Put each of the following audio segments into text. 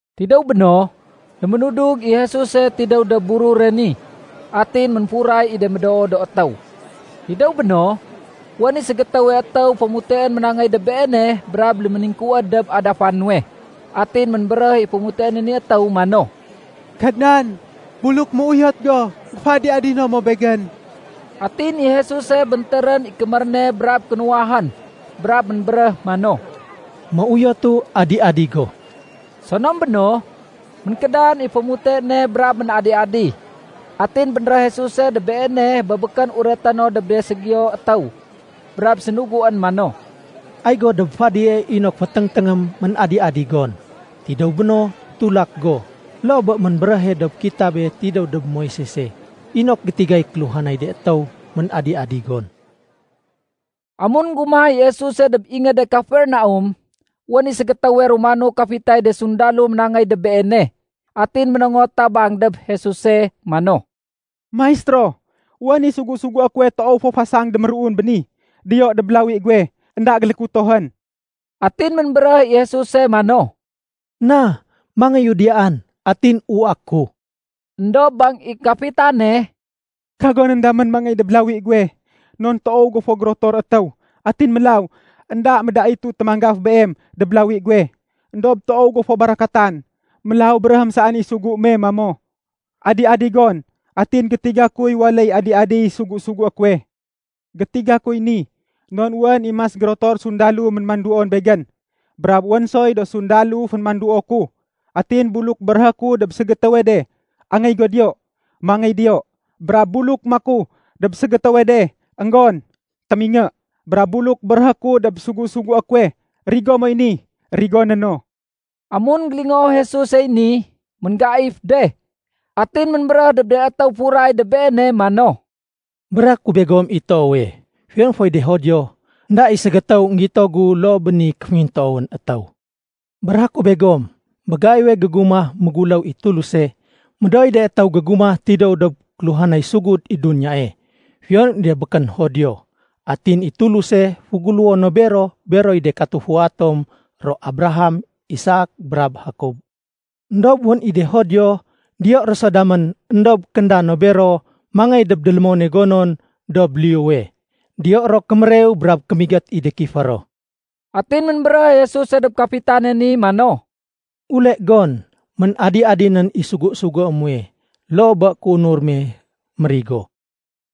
Tidéw béno, léménudug i Jesuse tidéw dob burure ni. Atin ménfuray i de médoo do étéw. Tidéw béno, wén i ségétéwe étéw fémuteén ménangéy dob Beene brab léméningkuwéd dob adafa nuwe. Atin ménbéréh i fémuteéne ni étéw mano, “Kadnan, buluk méuyot go, géféadi-adino mo begén.” Atin i Jesuse béntérén i kémér ne brab kénuwahén, brab ménbéréh mano, “Méuyotu. Adi-adi go.” Sonom béno, ménkédan i fémute ne brab ménadi-adi. Atin bénréh Jesuse dob beene bé békén ureté no dob de ségiyo étéw, brab sénuguén mano, “Ay go dob fadie inok féténgténgém ménadi-adi gon. Tidéw béno, tulak go, loo bé ménbéréhe dob kitabé tidéw dob Moisese inok gétigay kéluhanay de étéw ménadi-adi gon.” Amun énggumah i Jesuse dob ingéde Kafernaum, wén i ségétéwe Romano kafitay de sundalo ménangéy dob Beene. Atin ménongot tabang dob Jesuse mano, “Maistéro, wén i sugu-sugué kuwe toow fo fasang déméruun béni. Diyo dob lawi guwe énda gélékutohén.” Atin ménbéréh i Jesuse mano, “Na, mangéyu diyaan atin uwaé ku.” Endob bang i kafitane, “Kagonén damén mangéy dob lawi guwe. Non toow go fo gérotor étéw atin mélaw énda médaitu témanggaf Beem dob lawi guwe. Endob toow go fo barakatan, mélaw béréhém saén i sugu me mamo, ‘Adi-adi gon,’ atin gétiga kuy waléy adi-adiy sugu-sugué kuwe. Gétiga kuy ni non wén i mas gérotor sundalo mémanduon begén. Brab wén soy do sundalo fémanduo ku. Atin buluk béréhé ku dob ségétéwe de, ‘Angéy go diyoo,’ mangéy diyo. Brab buluk maku dob ségétéwe de, ‘Enggon,’ témingé. Brab buluk béréhé ku dob sugu-sugué kuwe, ‘Rigo moy ni,’ rigoné no.” Amun énggélingoo Jesusey ni, ménggaif de. Atin ménbéréh dob de étéw furay dob Beene mano, “Béréhé ku begom i toowe, fiyon foy de Judio, énda i ségétéw énggito gu loo bé ni kéféngintoowén étéw. Béréhé ku begom, bé gaiwe gégumah méguléw i Tuluse, médooy de étéw gégumah tidéw dob kéluhanay sugud i duniyae, fiyon i de békén Judio. Atin i Tuluse féguléwo no bero beroy de katufua tom ro Abraham, Isak, brab Jakob. Endob wén i de Judio diyo ro so damén éndob kénda no bero mangéy dob délémone gonon dob liyuwe. Diyo ro kémérew brab kémigét i de kifé ro.” Atin ménbéréh i Jesuse dob kafitane ni mano, “Ule gon, ménadi-adinén i sugu-sugué muwe loo bé kéunur me mérigo.”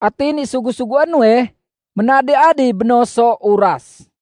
Atin i sugu-sugué nuwe, ménadi-adi bé no so uras.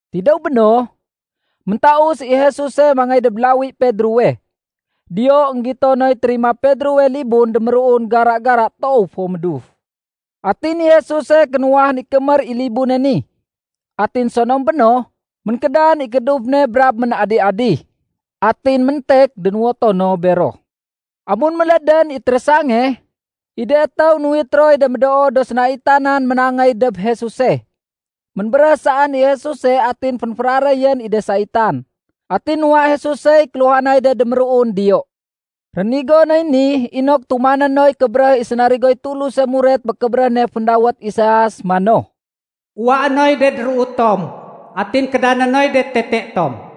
Tidéw béno, méntaus i Jesuse mangéy dob lawi Pedrowe. Diyo énggito noy térima Pedrowe libun déméruun gara-gara toow fo méduf. Atin i Jesuse kénuwahén i kémér i libune ni. Atin sonom béno, ménkédan i kééduf ne brab ménadi-adi. Atin méntek dénuwoto no bero. Amun mélédén i térésange, i de étéw nuwit roy de médoo do sénaitanan ménangéy dob Jesuse. Ménbéréh saén i Jesuse atin fénféraréyén i de saitan. Atin nuwa Jesusey kéluhanay de déméruun diyo. Rénigo noy ni inok tumané noy kébéréh i sénarigoy Tuluse muret bé kébéréh ne féndawét Isaias mano, “Uwaé noy de déruu tom, atin kédané noy de tete tom.”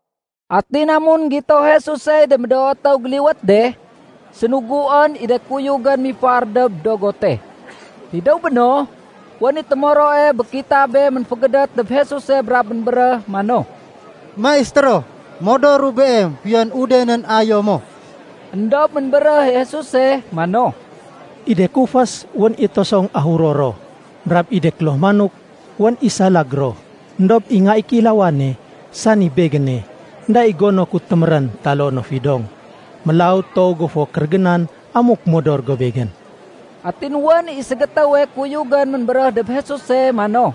Atin amun énggito Jesusey de médoo étéw géliwét de, sénuguén i de kuyugén mifar dob dogote. Tidéw béno, wén i témoroe bé kitabé ménfégédét dob Jesuse brab ménbéréh mano, “Maistéro, modoru Beem fiyon udenén ayo mo.” Endob ménbéréh i Jesuse mano, “I de kufés, wén i tosong ahuro ro. Brab i de kloh manok, wén i salag ro. Endob i Nga i Kéilawane, sani Begéne, énda i gono ku témérén taloo no fidong. Mélaw toow go fo kérégénan amuk modor go Begén.” Atin wén i ségétéwe kuyugén ménbéréh dob Jesuse mano,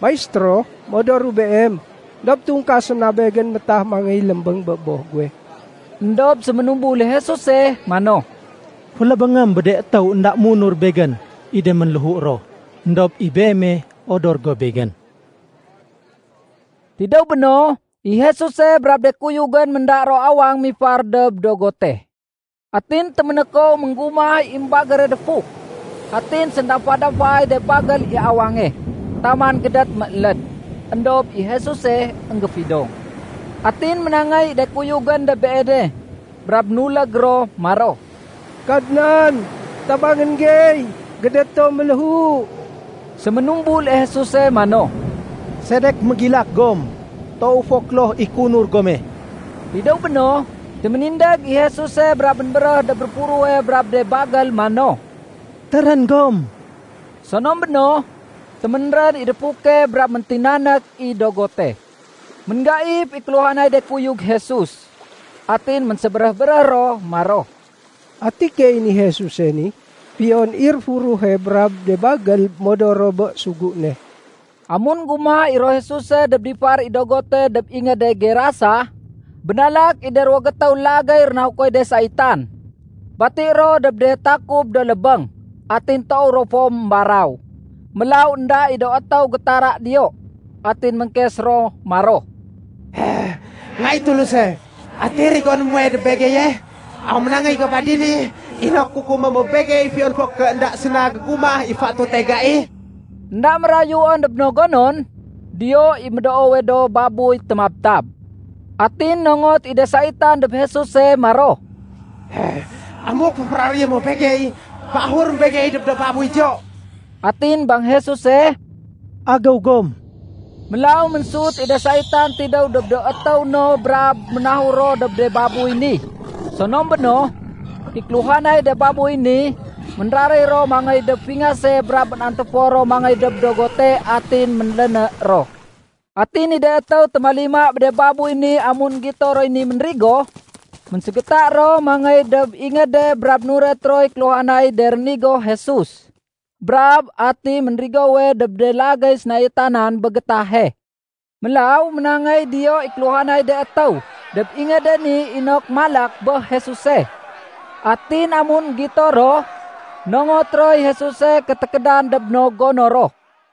“Maistéro, modoru Beem. Endob tungkasém na begén métah mangéy lémbéng bé boh guwe.” Endob séménumbul i Jesuse mano, “Félébéngém bé de étéw énda munur Begén i de ménléhu ro. Endob i beeme, odor go Begén.” Tidéw béno, i Jesuse brab de kuyugén ménda ro awang mifar dob dogote. Atin téménékow ménggumah i émbagére défuk. Atin séndamfa-damfaay de bagél i awange, taman gédét mééléd. Endob i Jesuse énggéfidong. Atin ménangéy i de kuyugén dob Beene, brab nulég ro maro, “Kadnan, tabangén gey! Gédét tom méléhu!” Séménumbul i Jesuse mano, “Sedek mégilak gom? Toow fo kloh i kéunur gome.” Tidéw béno, téménindég i Jesuse brab ménbéréh dob réfuruhe brab dob de bagél mano, “Térén gom!” Sonom béno, téménrén i défuke brab méntinanék i dogote. Ménggaif i kéluhanay de kuyug Jesus. Atin ménsébéréh-béréh ro maro, “Ati keeyén i Jesuse ni? Fiyon i réfuruhe brab de bagél modor ro bé sugu ne.” Amun énggumah i ro Jesuse dob difar i dogote dob ingéde Gerasa, bénalak i de ruwo gétéw lagéy rénahukoy de saitan. Bati ro dob de takub do lébéng atin toow ro fo émbaraw. Mélaw énda i do étéw gétara diyo. Atin ménkes ro maro, “Nga i Tuluse, ati rigoné muwe dob begeye? Aw ménangéy go ba dini inok kukumé mo begey fiyon fo ké énda séna gégumah i fatute gai?” Enda mérayuén dob no gonon, diyo i médoowe do babuy témabtab. Atin nongot i de saitan dob Jesuse maro, “Amuk féféraréyé mo begey, féahurém begey dob do babuy diyo.” Atin bang Jesuse, “Agéw gom.” Mélaw ménsut i de saitan tidéw dob do étéw no brab ménahur ro dob de babuy ni. Sonom béno, i kéluhanay de babuy ni, ménraréy ro mangéy dob fingase brab ménantéfor ro mangéy dob dogote atin ménléné ro. Atin i de étéw témalima bé de babuy ni amun énggito roy ni ménrigo, ménségéta ro mangéy dob ingéde brab nuret roy kéluhanay de rénigo Jesus brab ati ménrigowe dob de lagéy sénaitanan bé gétahe. Mélaw ménangéy diyo i kéluhanay de étéw dob ingéde ni inok malak bé Jesuse. Atin amun énggito ro, nongot roy Jesuse ké tékédan dob no gono ro.